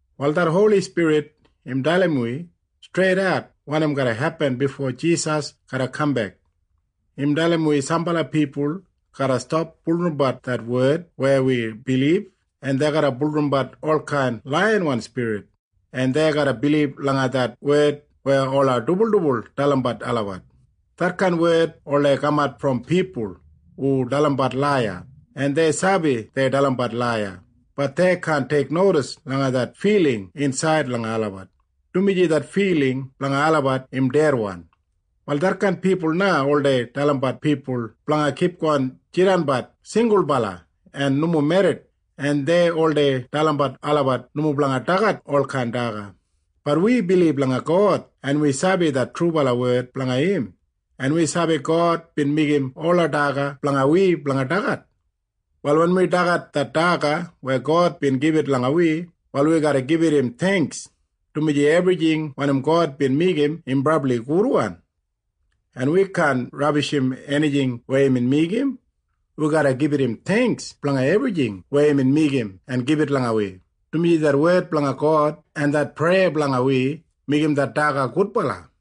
Wal det Holi Spirit im dalim wi streidat wanim garra hepin bifo Jisas garra kambek. Im dalim wi sambala pipul garra stap bulurrumbat det wed weya wi bilib, en dei garra bulurrumbat olkain laiyawan spirit, en dei garra bilib langa det wed weya ola dibuldibul dalimbat olabat. Detkain wed oldei kamat brom pipul hu dalimbat laiya. En dei sabi dei dalimbat laiya. Bat dei kaan teiknodis langa det filing insaid langa olabat, dumaji det filing blanga olabat im dedwan. Wal detkain pipul na oldei dalimbat pipul blanga kipgon jidanbat singulbala en nomo merrit, en dei oldei dalimbat olabat nomo blanga dagat olkain daga. Bat wi bilib langa God, en wi sabi det trubala wed blanga im, en wi sabi God bin meigim ola daga blanga wi blanga dagat. Wal wen wi dagat det daga weya God bin gibit langa wi, wal wi garra gibit im theingks, dumaji ebrijing wanim God bin meigim im brabli gudwan. En wi kaan rabishim enijing weya imbin meigim. Wi garra gibit im theingks blanga ebrijing weya imbin meigim en gibit langa wi, dumaji det wed blanga God en det preya blanga wi meigim det daga gudbala.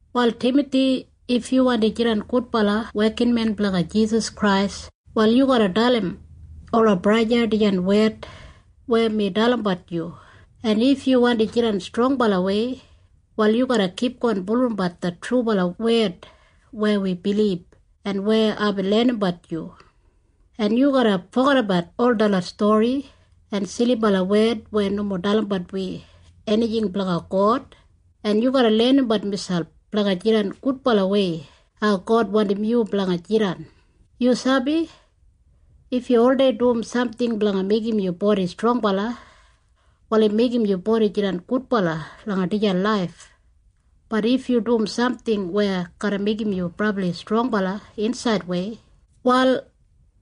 Wal Timathi, if yu wandi jidan gudbala wekinmen blanga Jisas Krais, wal yu garra dalim ola braja en sista dijan wed weya mi dalimbat yu. En if yu wandi jidan strongbalawei, wal yu garra kipgon bulurrumbat det trubala wed weya wi bilib en weya aibin lenimbat yu, en yu garra fogedabat ol detlot stori en silibala wed weya nomo dalimbat wi enijing blanga God, en yu garra lenimbat miselp blanga jidan gudbalawei hau God wandim yu blanga jidan. Yu sabi? If yu oldei dum samting blanga meigim yu bodi strongbala, wal im meigim yu bodi jidan gudbala langa dijan laif. Bat if yu dum samting weya garra meigim yu brabli strongbala insaidwei, wal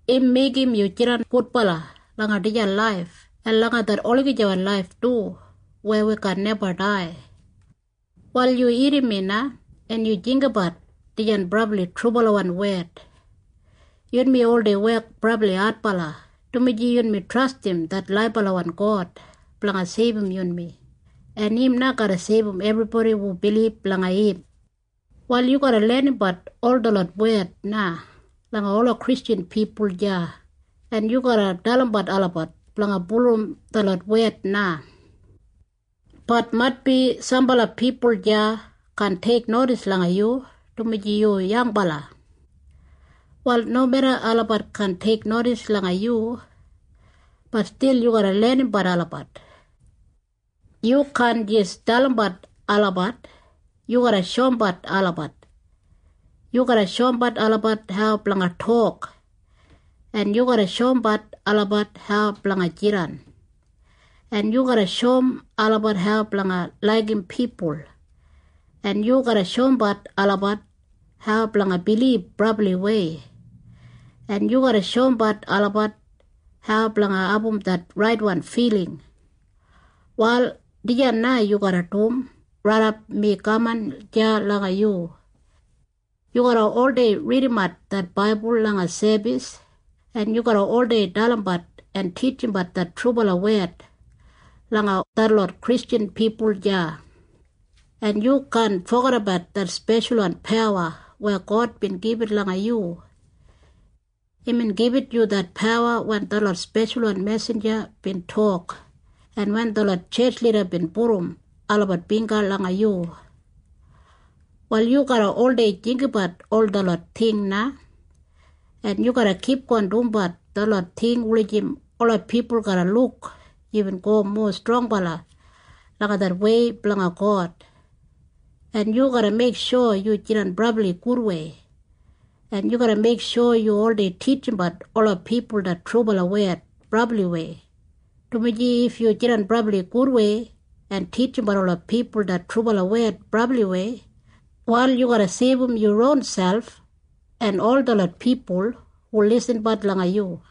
im meigim yu jidan gudbala langa dijan laif en langa det olagijawan laif du weya wi kaan neba dai. Wal yu irrim mi na, en yu jinggabat dijan brabli trubalawan wed. Yunmi oldei wek brabli adbala, dumaji yunmi trastim det laibalawan God blanga seibum yunmi, en im na garra seibum ebribodi hu bilib langa im. Wal yu garra lenimbat ol detlot wed na langa ola Kristjan pipul deya, en yu garra dalimbat olabat blanga bulurrum detlot wed na. Bat maitbi sambala pipul deya kaan teiknodis langa yu, dumaji yu yangbala. Wal nomeda olabat kaan teiknodis langa yu, bat stil yu garra lenimbat olabat. Yu kaan jis dalimbat olabat. Yu garra shoumbat olabat. Yu garra shoumbat olabat hau blanga tok, en yu garra shoumbat olabat hau blanga jidan, en yu garra shoum olabat hau blanga laigim pipul, en yu garra shoumbat olabat hau blanga bilib brabliwei, en yu garra shoumbat olabat hau blanga abum det raitwan filing. Wal dijan na yu garra dum raidap mi kaman deya langa yu. Yu garra oldei ridimbat det baibul langa sebis, en yu garra oldei dalimbat en titjimbat det trubala wed langa detlot Kristjan pipul deya, en yu kaan fogedabat det speshalwan pawa weya God bin gibit langa yu. Imbin gibit yu det pawa wen detlot speshalwan mesinja bin tok en wen detlot tjetj lida bin pudum olabat bingga langa yu. Wal yu garra oldei jinggabat ol detlot ting na, en yu garra kipgon dumbat detlot ting wulijim ola pipul garra luk yubin go mowa strongbala langa det wei blanga God. En yu garra meiksho yu jidan brabli gudwei, en yu garra meiksho yu oldei titjimbat ola pipul det trubala wed brabliwei, dumaji if yu jidan brabli gudwei en titjimbat ola pipul det trubala wed brabliwei, wal yu garra seibum yu ronselp en ol detlot pipul hu lisinbat langa yu.